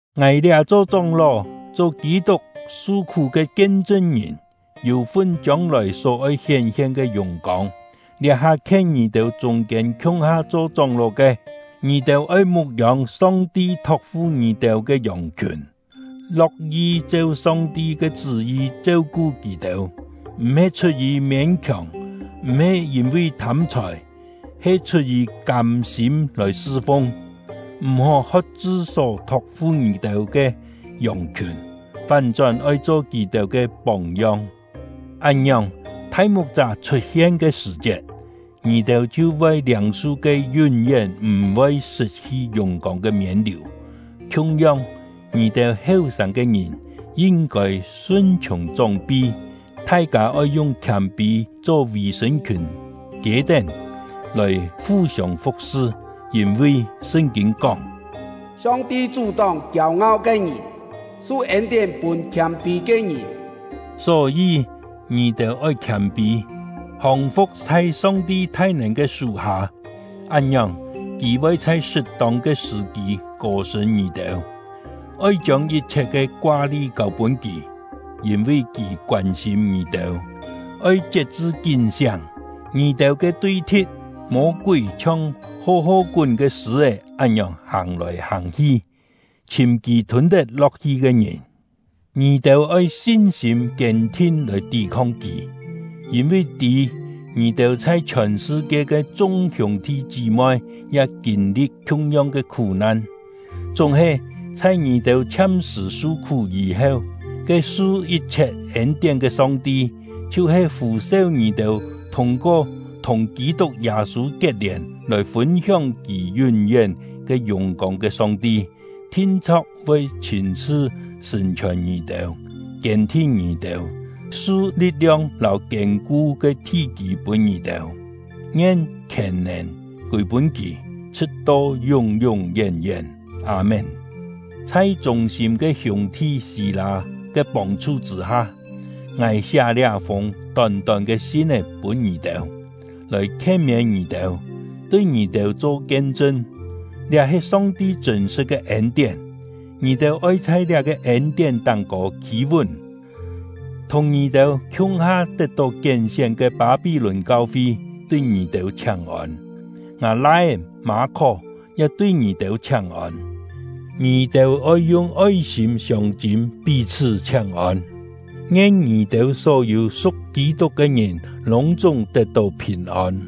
Ngài liá cho chóng-ló, cho Kî-tuk su-khú ke kien-chṳn-ngìn, yû-fun chiông-lòi só oi hién-hien ke yùng-kông, liá-ha khien ngì-têu chûng-kiên khiung-ha cho chóng-ló ke. Ngì-têu oi mu̍k-yông Song-ti thok-fu ngì-têu ke yòng-khiùn, lo̍k-yi cheu Song-ti ke chṳ́-yi cheu-ku kì-têu, m̀-he chhut-yì miên-kióng; m̀-he yîn-vi thâm-chhòi, he chhut-yì kâm-sîm lòi sṳ-fung. M̀-hó hot-chṳ só thok-fu ngì-têu ke yòng-khiùn, fán-chón oi cho kì-têu ke póng-yong. Án-ngiòng, thai mu̍k-chá chhut-hien ke sṳ̀-chiet, ngì-têu chhiu voi liâng-su ke yún-yén m̀-voi sṳt-hi yùng-kông ke miên-liù. Khiung-yong, ngì-têu heu-sâng ke ngìn yin-kôi sun-chhiùng chóng-pi. Thai-kâ oi yung khiâm-pî cho vì-sṳ̂n-khiùn kiê-tén lòi fu-siông fu̍k-sṳ; yîn-vi Sṳn-kîn kóng: Song-ti chú-tóng kiêu-ngau ke ngìn, su ên-tién pûn khiâm-pî ke ngìn. Só-yî, ngì-têu oi khiâm-pî, hòng-fu̍k chhai Song-ti thai-nèn ke sú-hâ, án-ngiòng, Kì voi chhai sṳt-tông ke sṳ̀-kî kô-sṳ̂n ngì-têu. Oi chiông yit-chhiet ke koa-li kâu-pûn Kì, yîn-vi Kì koân-sîm ngì-têu. Oi chiet-chṳ kín-siáng! Ngì-têu ke tui-thi̍t — Mô-kúi chhiong ho-ho-kún ke sṳ̂-é án-ngiòng hàng-lòi hàng-hi, chhìm kì thûn-tet-lo̍k-hi ke ngìn. Ngì-têu oi sin-sîm kiên-thin lòi tí-khong kì, yîn-vi tî, ngì-têu chhai chhiòn sṳ-kie ke chung hiûng-thi chí-moi ya kîn-li̍t khiung-yong ke khú-nan. Chúng-he, chhai ngì-têu chhiam-sṳ̀ su-khú yî-heu, ke su yit-chhiet ên-tién ke Song-ti, chhiu-he fû-seu ngì-têu thûng-ko thùng Kî-tuk Yâ-sû kiet-lièn lòi fûn-hióng Kì yún-yén ke yùng-kông ke Song-ti, thin-chho̍k voi chhîn-chhṳ sṳ̀n-chhiòn ngì-têu, kiên-thin ngì-têu, su li̍t-liong lâu kiên-ku ke thi-kî pûn ngì-têu. Ngien khièn-nèn kûi-pûn Kì, chhṳ̍t-to yún-yún yén-yén! Â-mén. Chhai chûng-sîm ke hiûng-thi Sî-lâ ke pông-chhu chṳ̂-ha, ngài siá liá-fûng tón-tón ke sin-é pûn ngì-têu, lòi khien-miên ngì-têu, tui ngì-têu cho kien-chṳn: Liá he Song-ti chṳ̂n-sṳ̍t ke ên-tién; ngì-têu oi chhai liá-ke ên-tién táng-kô khî-vún. Thùng ngì-têu khiung-ha tet-tó kién-sién ke Pâ-pí-lùn “Pâ-pí-lùn” khó-nèn am-sṳ “Lò-mâ”. kau-fi tui ngì-têu chhiáng-ôn; ngâ lai-é Mâ-khó ya tui ngì-têu chhiáng-ôn. Ngì-têu oi yung oi-sîm siông-chîm pí-chhṳ́ chhiáng-ôn. Ngien ngì-têu só-yû su̍k Kî-tuk ke ngìn lûng-chúng tet-tó phìn-ôn!